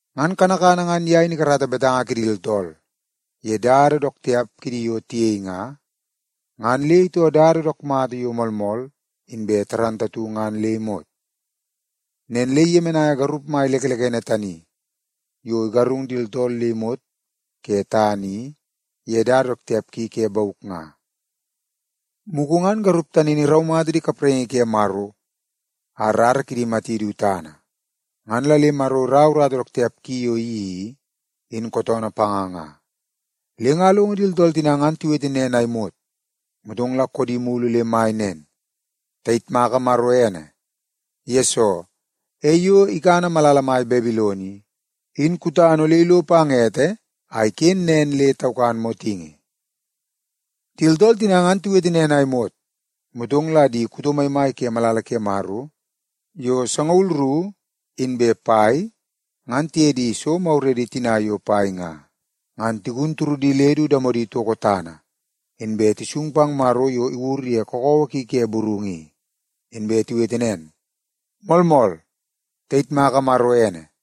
Ngan kanakana ngan ye in ikarata betanga kidi tooltool ye dada dook tiap kidi yo tiyei nga, ngan le itoo dada dook mata yo moolmool ngan le imot. Nen le iyemenaia garup mai lekelekene tani yo igarung di tooltool le imot ke tana i ye dada dook tiap ki ke bauk nga. Mugu ngan garup tani in iraumata di kapraingi ke Maro a rara kidi imati du tana, ngan la le Maro iraua urata dook tiap ki yo iyeii i, in kootoonoo panga nga.” Le nga alongo di tooltool tina ngan tiwete nen a imot, motong la koodi mulu le mai nen, “Tayitmaka Maro ene! Yesoo, ei yo ikana malala mai Babilon i, in kutana ole ilo pang ete a iken nen le taukan motingi.” Di tooltool tina ngan tiwete nen a imot, motong la di kuto maimai ke malala ke Maro yo sangaul ru inbe pai ngan tiye di so maguredi tina yo pai nga, ngan tigun turudi le du damodi toko tana, inbe tisung pang Maro yo iwur ye kakawa ki ke burungu i. Inbe tiwete nen, “Moolmool, tayitmaka Maro ene!”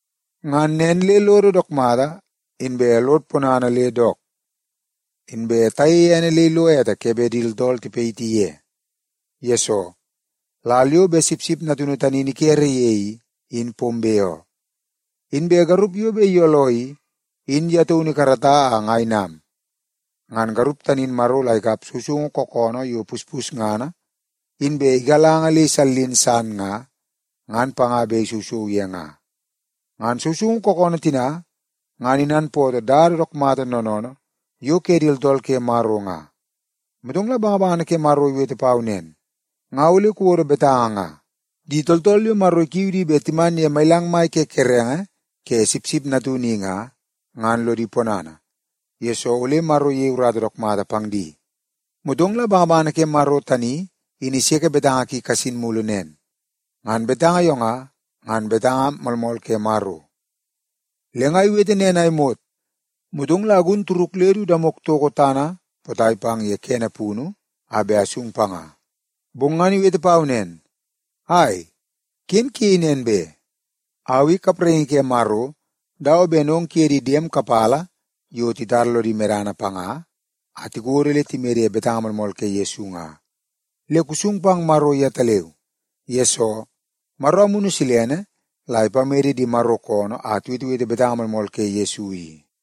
Ngan nen le lodo dook mata inbe lod ponana le dook. Inbe tayeie ene le ilo ete ke bet di tooltool tipayiti ye. Yesoo, lal yo bet Sipsip Natunu tani in ikere ye i, in pombe oo. Inbe garup yo bet iyooloo i, in ye taunu ikarata a nga inam. Ngan garup tani in Maro la ikap sousoungu kookoonoo yo puspusngana inbe igalanga le isallin san nga, ngan panga bet isousou ye nga.” Ngan sousoungu kookoonoo tina ngan inanpootoo dada dook mata noonoonoo yo ke di tooltool ke Maro nga. Motong la bangabangana ke Maro iwete pau nen, “Nga ole kuwodo betanga nga: ‘Di tooltool yo Maro ikiu di bet timan ye mailang mai ke kerenge ke Sipsip Natunu i nga, ngan lodi ponana, yesoo ole Maro iyei urata dook mata pang di.’” Motong la bangabangana ke Maro tani in iseke betanga ki kasin mulu nen, “Ngan betanga yo nga, ngan betanga moolmool ke Maro.” Le nga iwete nen a imot, motong la agun turuk le du damok itoko tana potai pang ye kene punu a bet asung panga. Bong ngan iwete pau nen, “Ai, ken kuyei nen be! Au i kapraingi ke Maro dawa ben ong kuye di diem kapala yo titara lodi medana panga a tikodo le timede ye betanga moolmool ke Yesu nga. Le kusung pang Maro yetaleu! Yesoo, Maro Amunu Silene la ipamede di Maro koonoo a tiwetewete betanga moolmool ke Yesu i.”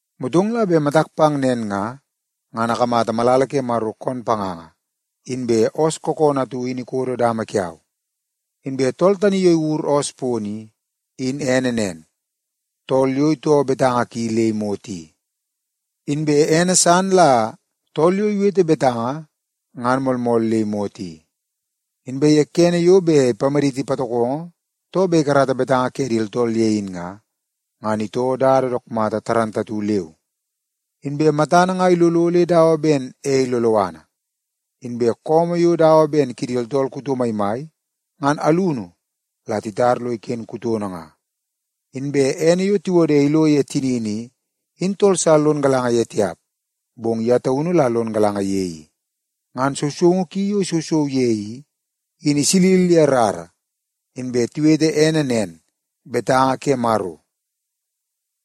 Motong la bet matak pang nen nga, ngan akamata malala ke Maro koon panganga inbe oos kookoonoo atu in ikodo dama kiau. Inbe tool tani yo iwur oos pono i, in ene nen, Tool Yo Itoo Betanga Ki Le Imot i. Inbe ene san la Tool Yo Iwete Betanga Ngan Moolmool Le Imot i. Inbe ye kene yo bet ipamaditi patokongo too bet ikarata betanga ke di tooltool ye in nga, ngan itoo dada dook mata leu. Inbe matana nga ilolo le dawa ben ei loloana, inbe su yo dawa ben kidi tooltool kuto maimai, ngan alunu la titar lo iken kutono nga. Inbe ene yo tiwode ilo ye tinini i, in tool sa lono galanga ye tiap, bong ye taunu la lon galanga ye i. Ngan sousoungu ki yo isousou ye i, in isilil ye rara. Inbe tiwete ene nen, Betanga ke Maro.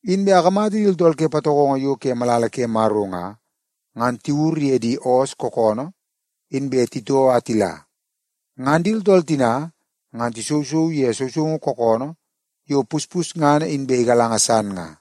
Inbe akamata di tooltool ke patokongo yo ke malala ke Maro nga, ngan tiwur ye di oos kookoonoo inbe titoo a tila. Ngan di tooltool tina ngan tisousou ye sousoungu kookoonoo yo puspusngana inbe igalanga san nga.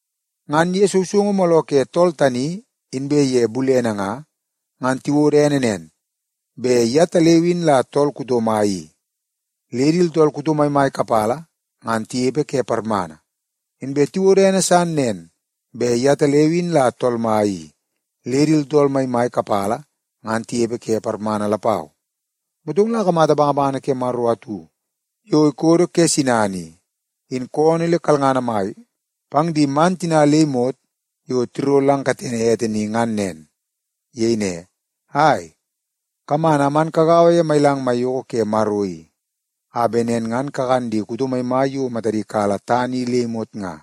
Ngan ye sousoungu mooloo ke tool tani inbe ye bulene nga, ngan tiwodo ene nen, bet yetaleu in la Tool Kuto Mai i, le di tooltool kuto maimai kapala ngan tinepe ke parmana. Inbe tiwodo ene san nen bet yetaleu in la Tool Mai i, le di tooltool maimai kapala ngan tinepe ke parmana lapau. Motong la akamata bangabangana ke Maro atu yo ikodo ke sinana i, in koonoo le kalngana mai pang di man tina le imot yo tiro lang katene ete ni ngan nen. Iyei ne, “Ai, kaman a man kagaua ye mailang maiyoko ke Maro i, a bet nen ngan kakan di kuto maimai yo matadi kala tana i le imot nga,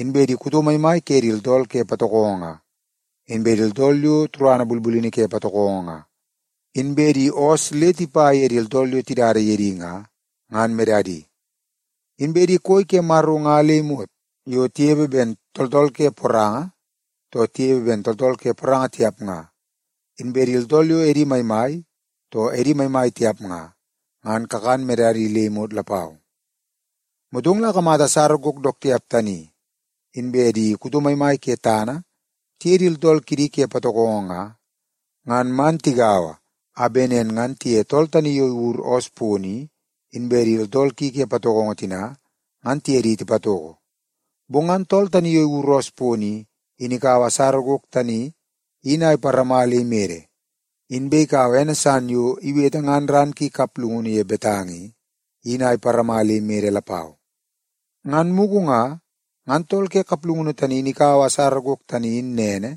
inbe di kuto maimai ke di tooltool ke patokongo nga, inbe di tooltool yo turadi bulbulini ke patokongo nga, inbe di oos le tipa ye di tooltool yo tidada ye di nga, ngan medadi. Inbe di koi ke Maro nga le imot yo tinepe ben tooltool ke poranga too tinepe ben di tooltool ke poranga tiap nga, inbe di tooltool yo edi maimai too edi maimai tiap nga, ngan kakan medadi le imot lapau.” Motong la akamata asara gok dook tiap tani, inbe di kuto maimai ke tana tiye di tooltool kidi ke patokongo nga, ngan man tigaua a bet nen ngan tiye tool tani yo iwur oos pono i, inbe di tooltool ki ke patokongo tina, ngan tiye di tipatoko. Bong ngan tool tani yo iwur oos pono i, in ikaua asara gok tani in a iparama le imede. Inbe ikaua ene san yo iwete ngan ran ki kaplungunu ye betanga i, in a iparama le imede lapau. Ngan mugu nga, ngan tool ke kaplungunu tani in ikaua asara gok tani in nene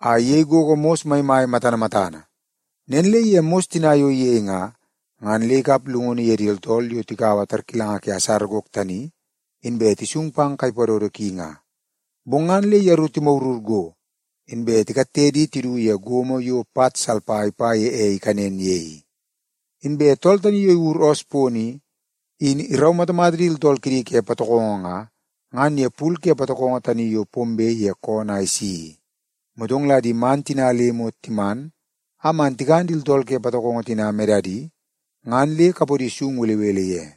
a iyei gogo mos maimai matana matana. Nen le ye mos tina yo iyei nga, ngan le ikap llungunu ye di tooltool yo tikaua tarkilanga ke asara gok tani inbe tisung pang kai padodo ki nga. Bong ngan le yeru timagurgur go, inbe tikatte di tidu ye gomo yo pat salpa ipa ye ei ikanen ye i. Inbe tool tani yo iwur oos pono i, in iraumatamata di tooltool kidi ke patokongo nga, ngan ye pul ke patokongo tani yo pombe ke koonoo a isi i. Motong la di man tina le imot timan a man tikan di tooltool ke patokongo tina medadi, ngan le kapodi sung belebele ye.